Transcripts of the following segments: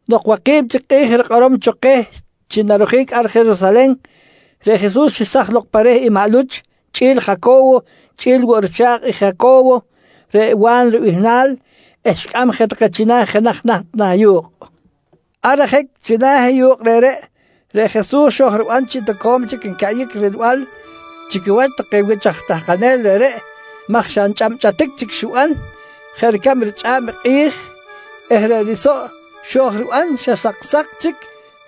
Nok waki̱b chic kꞌi̱j rikꞌorom cho keh chi narojic ar Jerusalen, reꞌ Jesus xesaj lok pa reh i maꞌ Luch chꞌi̱l Jaco̱wo chꞌi̱l woꞌ i richa̱kꞌ i Jaco̱wo reꞌ Wa̱n ribihnal eh xicꞌam je take china̱ jenaj naht na̱ yu̱kꞌ. Ar ajic china̱ i yu̱kꞌ reꞌreꞌ, reꞌ Jesus xo̱j riban chi toco̱m chic ncaꞌyic rilbal chi quiwach take wich aj tahkanel reꞌreꞌ maj xa nchꞌabchꞌatic chic xiban jeꞌ ricab richꞌa̱b i kꞌi̱j eh reꞌ risoꞌ xo̱j riban xa saksa̱k chic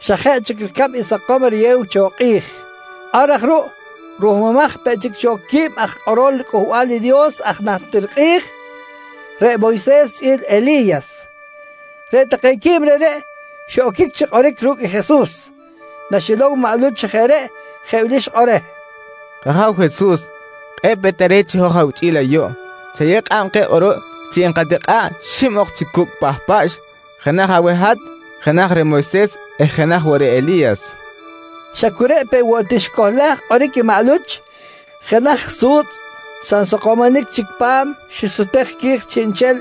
xa jeꞌ chic ricab i sakom riyew cho i kꞌi̱j. Ar aj ruꞌ ruhmumaj peꞌ chic cho quib aj kꞌorol riCꞌuhbal i Dios aj najtir kꞌi̱j, reꞌ Moyses chꞌi̱l Eli̱yas. Reꞌ take quib reꞌreꞌ xiꞌoquic chi kꞌoric ru̱cꞌ i Jesus. Naxilow maꞌ Luch chi jeꞌ reꞌ, jeꞌ wili xikꞌor je reh: «K-Aja̱w Jesus, kꞌe̱ꞌ peꞌ tare̱t chi hoj awichꞌi̱l ayuꞌ. Chayew kꞌab keh kꞌuruꞌ chi enkatikꞌa̱ꞌ xib ok chi cucꞌ pahpaꞌx. Jenaj aweh hat, jenaj reh Moyses eh jenaj woꞌ reh Eli̱yas, nqui reh. Xa cu reꞌ peꞌ woꞌ ti xicohlaj kꞌoric i maꞌ Luch, jenaj su̱tzꞌ xa nsakomonic chic pa̱m xisutej qui̱j chiꞌnchel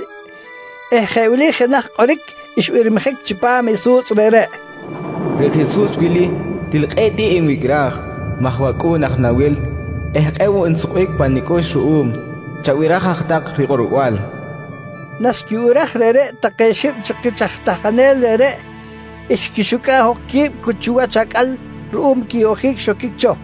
eh jeꞌ wili jenaj kꞌoric xbirmijic chipam i su̱tzꞌ reꞌreꞌ: «Reꞌ Jesus wili til kꞌe̱ꞌ tiꞌ nwicꞌraj maj wAcꞌu̱n aj nawil eh kꞌe̱ꞌ woꞌ nsukbic pa nicꞌux ruꞌum. Chabiraj aj tak rikꞌorbal, nqui kꞌoric xbanjic cho. Naxquibiraj reꞌreꞌ take xib chi kich aj tahkanel reꞌreꞌ, xquixucꞌa̱ꞌ jok qui̱b cu wach acꞌal ruꞌum quiyoꞌjic xoquic cho,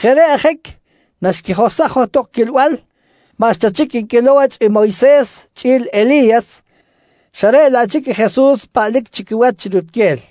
Jeꞌ reꞌ ajic naxquijohsaj johtok quilbal, maꞌxta chic nquilow wach i Moyses chꞌi̱l Eli̱yas, xa reꞌ laꞌ chic i Jesus paꞌlic chi quiwach chi rutquel.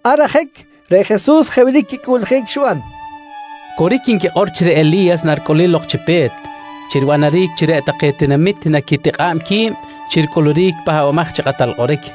Ar ajic reꞌ Jesus jeꞌ wili quicꞌuꞌljic xiban: «Coric nquikꞌor chi reꞌ Eli̱yas naricꞌulic lok chi pe̱t chi ribanaric chi reꞌ take tinamit naquitikꞌa̱b qui̱b chi ricꞌuluric i Pahbamaj chi Kꞌatal Kꞌoric,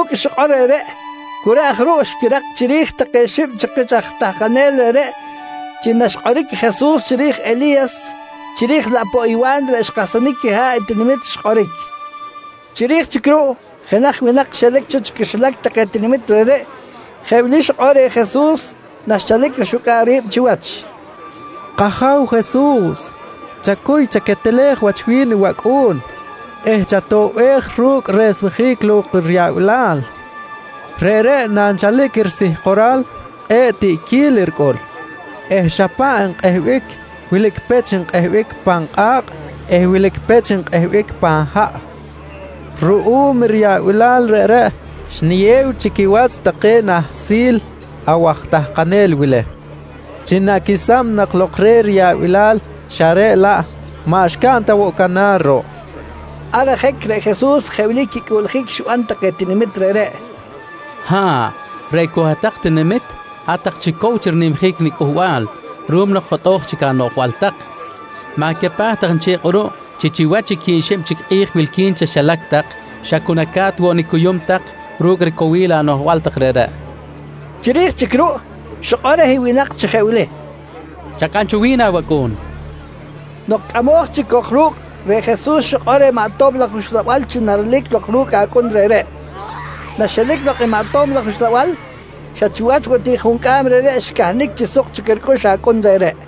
Ru̱cꞌ i xikꞌor reꞌreꞌ, cu reꞌ aj ruꞌ xquirak chiri̱j take xib chi kich aj tahkanel reꞌreꞌ chi naxkꞌoric i Jesus chiri̱j Eli̱yas chiri̱j laꞌ poꞌ i Wa̱n reꞌ xkahsanic quiha̱ꞌ i tinamit, xkꞌoric. Chiri̱j chic ruꞌ jenaj winak xelic cho chi quixilac take tinamit reꞌreꞌ jeꞌ wili xikꞌor reh Jesus naxchalic rixucꞌa̱ꞌ ri̱b chiwach: «K-Aja̱w Jesus, chacuy chaquetelej wach wi̱n i wacꞌu̱n eh chatoꞌbej ru̱cꞌ resmejic lok riyaꞌbilal. Reꞌreꞌ nanchalic risihkoral, kꞌe̱ꞌ tiꞌquil ricꞌul eh xa paꞌ nkꞌehbic. Wilic pech nkꞌehbic pan kꞌa̱kꞌ eh wilic pech nkꞌehbic pan haꞌ. Ruꞌum riyaꞌbilal reꞌreꞌ, xniyew chi quiwach take nahsil awaj tahkanel wili chi naquesam nak lok reh riyaꞌbilal xa reꞌ laꞌ maꞌ xcaꞌn ta woꞌ canar ruꞌ, nqui reh. Ar ajic reꞌ Jesus jeꞌ wili quicꞌuꞌljic xiban take tinamit reꞌreꞌ: «Ha̱ꞌ, reꞌ cok hat-tak tinamit, hat-tak chic cow chi rinimjic niCꞌuhbal ruꞌum jotꞌo̱j chic anoꞌjbal tak! Ma̱capaj tak nchel kꞌuruꞌ chi chiwach i quib xib chic kꞌi̱j wilqui̱n chaxilac tak xa cu naca̱t woꞌ nicuyum tak ru̱cꞌ ricowil anoꞌjbal tak reꞌreꞌ, nqui chi kꞌilbal queh. Chiri̱j chic ruꞌ, xikꞌor reh winak chi jeꞌ wili: «Chacꞌam cho wi̱n awacꞌu̱n, nqui reh. Nok cꞌamoj chic cok ru̱cꞌ, reꞌ Jesus xikꞌor reh maꞌ tob laj uxlabal chi narelic lok ru̱cꞌ acꞌun reꞌreꞌ. Naxelic lok i maꞌ tob laj uxlabal, xa chiwach woꞌ ti juncꞌam reꞌreꞌ xcahnic chi suk chic ricꞌux acꞌun reꞌreꞌ.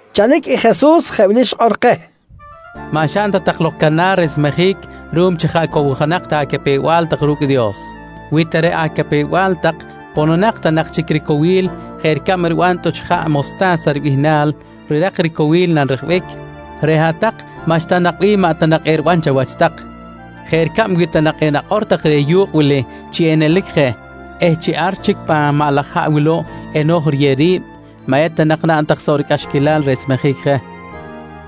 Chalic i Jesus jeꞌ wili xikꞌor keh: «Maꞌ xaꞌn ta tak lok canar resmejic ruꞌum chi jaꞌ cowjonak ta acapew-bal tak ru̱cꞌ i Dios. Wi ta reꞌ acapew-bal tak pononak ta nak chic ricowil jeꞌ ricab riban tꞌuch ijaꞌ mosta̱sa ribihnal rirak ricowil nanrejbic, reꞌ hat-tak maꞌxta nak bih maꞌ ta nak eriban chawach. Jeꞌ ricab wi ta nak enakꞌor tak reh yu̱kꞌ wili chi enelic je eh chi ar chic pan maꞌ laj haꞌ wuluꞌ eno̱j riyew ri̱b, maꞌ eta nak naꞌn tak soꞌ ricꞌaxquilal resmejic je.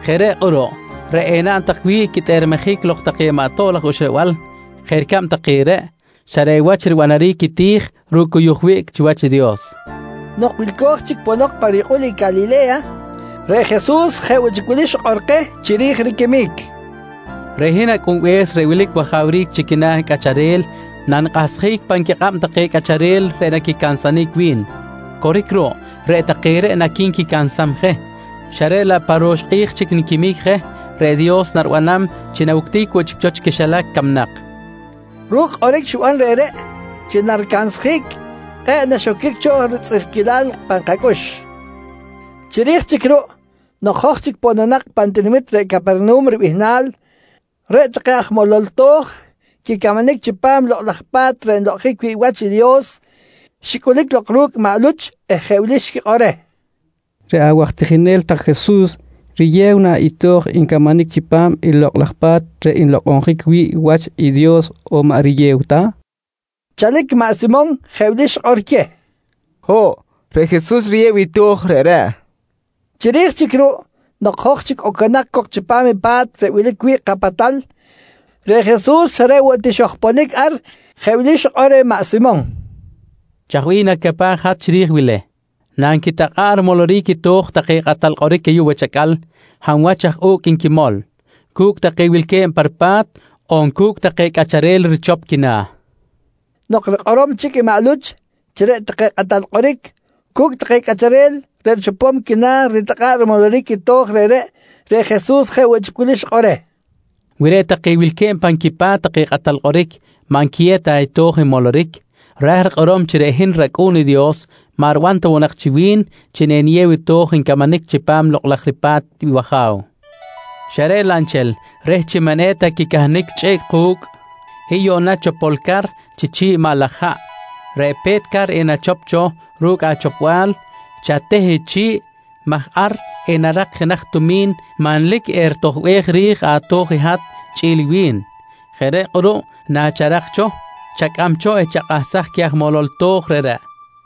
Jeꞌ reꞌ kꞌuruꞌ reꞌ enaꞌn tak wi̱ꞌ quitꞌermejic lok take maꞌ tob laj uxlabal jeꞌ ricab take reꞌ, xa reꞌ wach ribanaric i ti̱j ru̱cꞌ cuyuj wiꞌc chiwach i Dios, nqui Jesus. Nok wilco̱j chic ponok pa riyukꞌul i Calile̱ya, reꞌ Jesus jeꞌ woꞌ chic wilic xikꞌor keh chiri̱j riquimic: «Reꞌ hin Acꞌunbe̱s reꞌ wilic wajawric chi quina̱ cꞌacharel nanikꞌahsjic pan quikꞌab take cꞌacharel reꞌ naquicansanic wi̱n. Coric ruꞌ, reꞌ take reꞌ naqui̱nquicansam je xa reꞌ laꞌ pa ro̱x kꞌi̱j chic niquimic je, reꞌ Dios naribanam chi nawuctic woꞌ chic cho chi quixilac camnak, nqui xikꞌor keh. Ru̱cꞌ kꞌoric xiban reꞌreꞌ chi naricansjic, kꞌe̱ꞌ naxoquic cho ritzꞌirquilal pan kacꞌux. Chiri̱j chic ruꞌ, nok hoj chic pononak pan tinamit reꞌ Capernahum ribihnal, reꞌ take aj molol to̱j quicamanic chipam Lokꞌ laj Pa̱t reꞌ nlokꞌonjic wi̱ꞌ wach i Dios, xicꞌulic lok ru̱cꞌ maꞌ Luch eh jeꞌ wili xquikꞌor reh: «Reꞌ awaj tijinel tak Jesus, riyew na i to̱j ncamanic chipam i Lokꞌ laj Pa̱t reꞌ nlokꞌonjic wi̱ꞌ i wach i Dios on maꞌ riyew ta? nqui take reh. Chalic maꞌ Simon jeꞌ wili xikꞌor queh: «Ho̱ꞌ, reꞌ Jesus riyew i to̱j reꞌreꞌ, nqui xikꞌor queh. Chiri̱j chic ruꞌ nok hoj chic oconak cok chipam i pa̱t reꞌ wilic wi̱ꞌ kapatal, reꞌ Jesus xa reꞌ woꞌ ti xojponic ar jeꞌ wili xikꞌor reh maꞌ Simon: «Chaj bih nacapaj hat chiri̱j wili: Nanquitakꞌa̱ꞌ rimoloric i to̱j take kꞌatal kꞌoric ayuꞌ wach acꞌal, hab wach aj u̱cꞌ nquimol? Cu̱cꞌ take wilque̱b pa ripa̱t on cu̱cꞌ take cꞌacharel richop quina̱? nqui reh. Nok rikꞌorom chic i maꞌ Luch chi reꞌ take kꞌatal kꞌoric cu̱cꞌ take cꞌacharel reꞌ richopom quina̱ ritakꞌa̱ꞌ rimoloric i to̱j reꞌreꞌ, reꞌ Jesus jeꞌ woꞌ chi wili xikꞌor reh: «Wi reꞌ take wilque̱b pan quipa̱t take kꞌatal kꞌoric maꞌ nquiyew ta i to̱j nmoloric, ra̱j rikꞌorom chi reꞌ hin rAcꞌu̱n i Dios maꞌ riban ta woꞌ nak chi wi̱n chi eniyew i to̱j ncamanic chipam Lokꞌ laj riPa̱t i wAja̱w, xa reꞌ laꞌ nchel reh chi maꞌ eta quicahnic chꞌiꞌc ku̱cꞌ, hiy yuꞌna chopol car chi chi̱ꞌ i maꞌ laj haꞌ. Reꞌ pe̱t car enachop cho ru̱cꞌ achopbal, chateh i chi̱ꞌ maj ar enarak jenaj tumi̱n manlic eritojbej ri̱j ato̱j i hat chꞌi̱l i wi̱n. Jeꞌ reꞌ kꞌuruꞌ nacharak cho, chacꞌam cho eh chakꞌahsaj queh aj molol to̱j reꞌreꞌ, nqui Jesus reh.